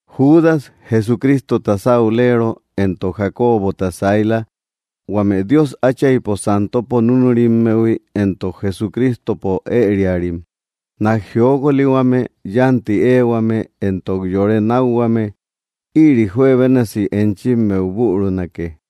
Judas, Jesucristota saulero, entok Jacobota saila, huame Dios Atchaipo santopo núnurimmehui entok Jesucristopo ëriarim, Nak jiokolihuame, yánti éehuame, entok yore nákhuame, ïri juebénasi enchimmeu burunake.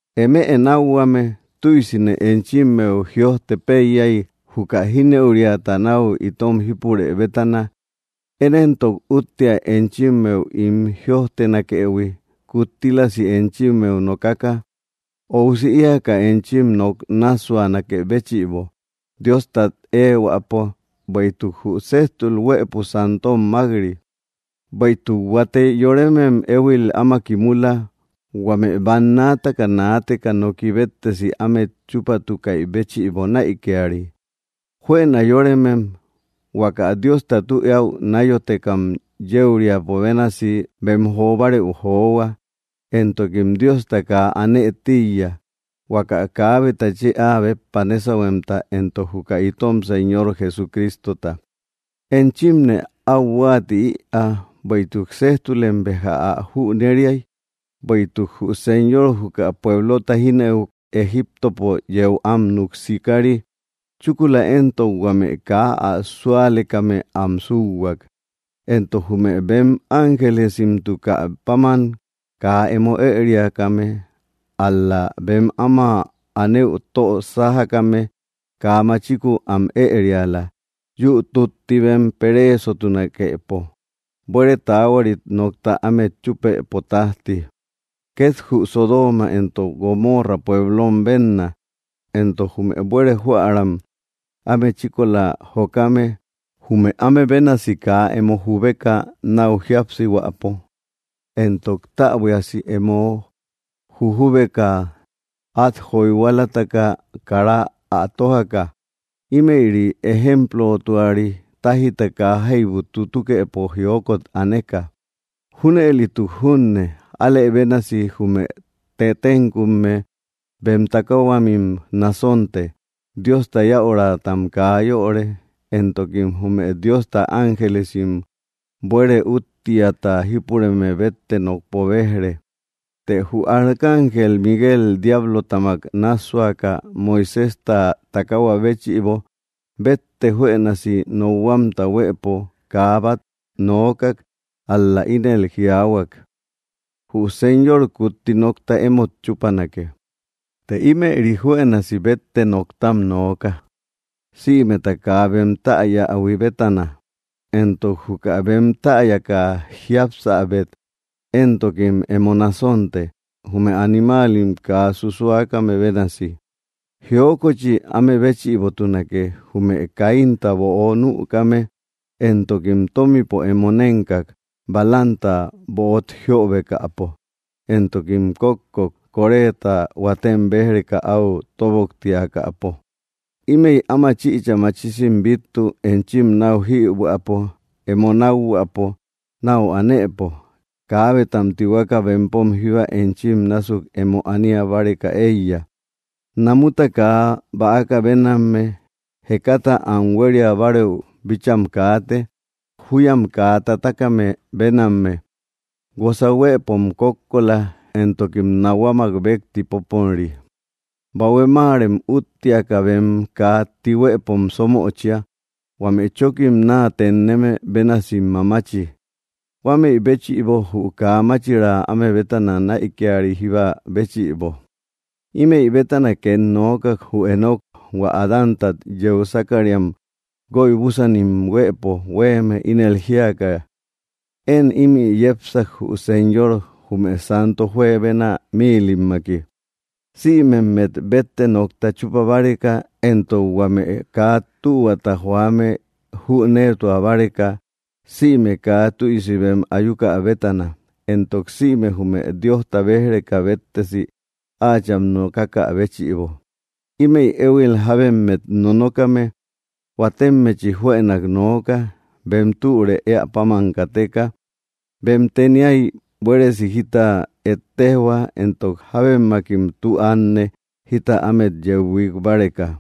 Eme nákhuame, tüisine enchimmeu jïojte péiyay, juka jínëuriata nau itom jípurë bétana; én éntok úttea enchimmeu ín jïojtenakëhui, kuttílasi enchimmeu nokaka, óusi eeaka enchim nok nássuanakë béchïbo, Diostat ehuäpo. Bueïtuk jü séjtul huëpo santom mak‑ri. Bueïtuk huate yoremem éhuil áma kimula, huame bannaataka naateka noki béttesi ámet chúpatukaï béchïbo näikiari. Juëna yóremem; huaka Diosta tü eäu náyotekam yéuriapo bénasi bem jo bárëu johua; entokim Diosta kaa anë tíiya, huaka kaabeta chë áa béppa nésahuemta, entok juka itom Señor Jesucristota. Enchimne áu huáati ïa, bueïtuk sejtulem béja ä jüneriai, bueïtuk jü Señor juka pueblota jínëuk, Egiptopo yeu am núk sikari, chúkula éntok huame kaa ä súalekame am súuhuak. Entok jume bem ángelesimtukä páman kaa emo ëriakame, ál‑la bem áma anëu tö sájakame, kaa machiku am ëriala, yü tutti bem pereesomtunakepo, buére taahuarit nokta ámet chúpëpo tájti. Ket jü Sodooma entok Gomoora pueblom bénna, entok jume buere joaram áme chíkola jokame, jume áme bénasi kaa emo jubeka náu jíapsihuäpo entok täbuiasi emo jujubeka at joyhualataka kara ä tojaka; ímëri ejemplomtuari, táijta kaa jaibu tutukëpo jiokot aneka. Júnëlituk junne, alëbénasi jume tettenkume bem takaahuamim násonte, Diosta yäuratam kaa yöre, entokim jume Diosta ángelisim buere úttiata jípureme bette nokpo bejre. Të jü arcángel Miguel diablotamak nássuäka Moiséjta takaahua béchïbo, bétte juenasi nokhuamta huëpo kaa bat nookak, ál‑la ínel jiaahuak: “Jü Señor kutti nokta emót chupanake.” Të ímëri juenasi bette noktam nooka, sïmeta kaa bem täyähui bétana; entok juka bem täyaka jiápsabet entokim emo násonte, jume animalim kaa susuakame bénasi. ¡Jiokochi áme béchïbotunake! Jume Caínta böo nukame; entokim tómipo emo nénkak, Balaamta böt jiobekäpo; entokim kókkok, Coréta huatem bej‑reka áu tóboktiakäpo. Ímëi áma chïcha machisim bittu, enchim náu jïhuäpo emo nakhuäpo nau anëpo. Kabetam tihueka bempom jíba enchim násuk emo ania báreka eiya. Namuta kaa bäaka bénamme; jekata am hueriabareü bícham kaate, júyam kaa tatakame bénamme. Guosa huëpom kókkola, entokim nahuamak békti póponri. Bahue máarem úttiaka bem kaa tihuëpom sómöchia, huame chókim naa tenneme bénasim mamachi; huämei béchïbo jü kaa máchiraa áme bétana näikiari jíba béchïbo. Ímëi bétana ket nookak, jü Enoc, hua Adántat yeu sákariam guoybusanim huëpo huéeme, ínel jíaka: “Én ímï yepsak, jü Señor, jume santo juebena míilimmaki, sïmemmet bétte nokta chúpa báreka, éntok huame kaa tühuata joame jüneetua báreka, sïme kaa tüisi bem ayuka bétana, entok sïme jume Diosta bej‑reka béttesi áacham nokakä béchïbo.” Ímëi éhuil jábemmet nonokame, huatemmechi juenak nooka, bem türë eä páman kateka, bem teniay buéresi jita ëettejhua, entok jábemmakim tü ánne, jita ámet yeu huik báreka.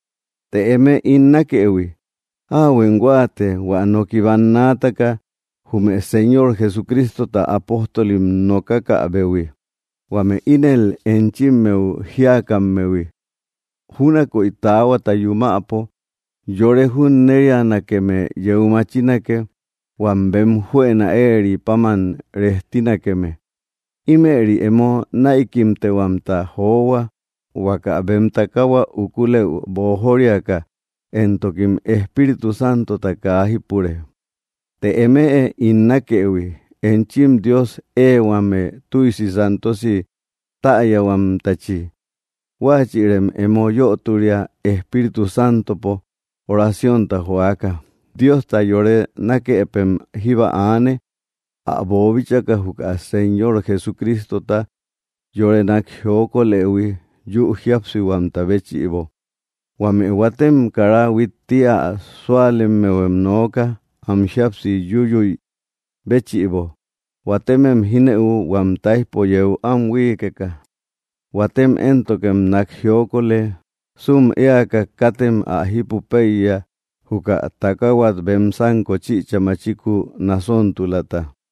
Të eme, ín nákëhui, áahuem huáate, hua noki bannaataka jume Señor Jesucristota apóstolim nokakäbehui, huame ínel enchimmeu jíakammehui: “Júnakoy taahuata yumäpo yore junnerianakeme yeu machinake, huam bem juëna éeri páman rejtinakeme.” Imëri emo näikimtehuamta johua, huaka bem takaahua ukulëu boojoriaka; entokim Espíritu Santota kaa jípure. Të emëe, ín nákëhui, enchim Dios éehuame tuysi santosi täyahuamtachi, huachïrem emo yöturia, Espíritu Santopo oraciónta joaka. Diosta yore nakepem jíba aane, ä boobíchaka juka Señor Jesucristota yore nak jiokolëhui, yü jíapsihuamta béchïbo. Huame huatem kara huitti ä súalemmehuem nooka, am jíapsi yúyüi béchïbo. Huatemem jínëu, huam táijpo yeu am huíikeka; huatem éntokem nak jiokolë, sum éaka, katem ä jipu peiya, juka takahuat bem sánko chïcha machiku nasontulata,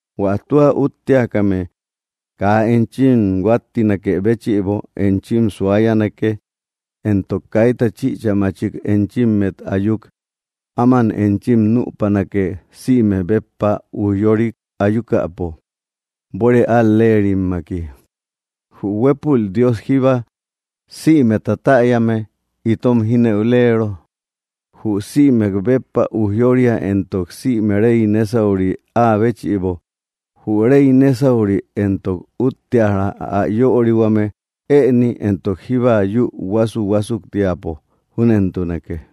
Huä tua útteakame kaa enchim huáttinakë béchïbo enchim suayanake, entok kaita chïcha machik enchimmet ayuk, áman enchim nüpanake, sïmek béppa ujyorik ayukäpo, buére al‑lerimaki. Jü huépul Dios jíbba, sïmeta täyame, itom jínëulero, jü sïmek béppa ujyooria entok sïme Rey nésauri áa béchïbo, jü rey nesauri entok utteara, ä yörihuame, ëni éntok jíba yü huasuhuasuktiapo. Júnentunake.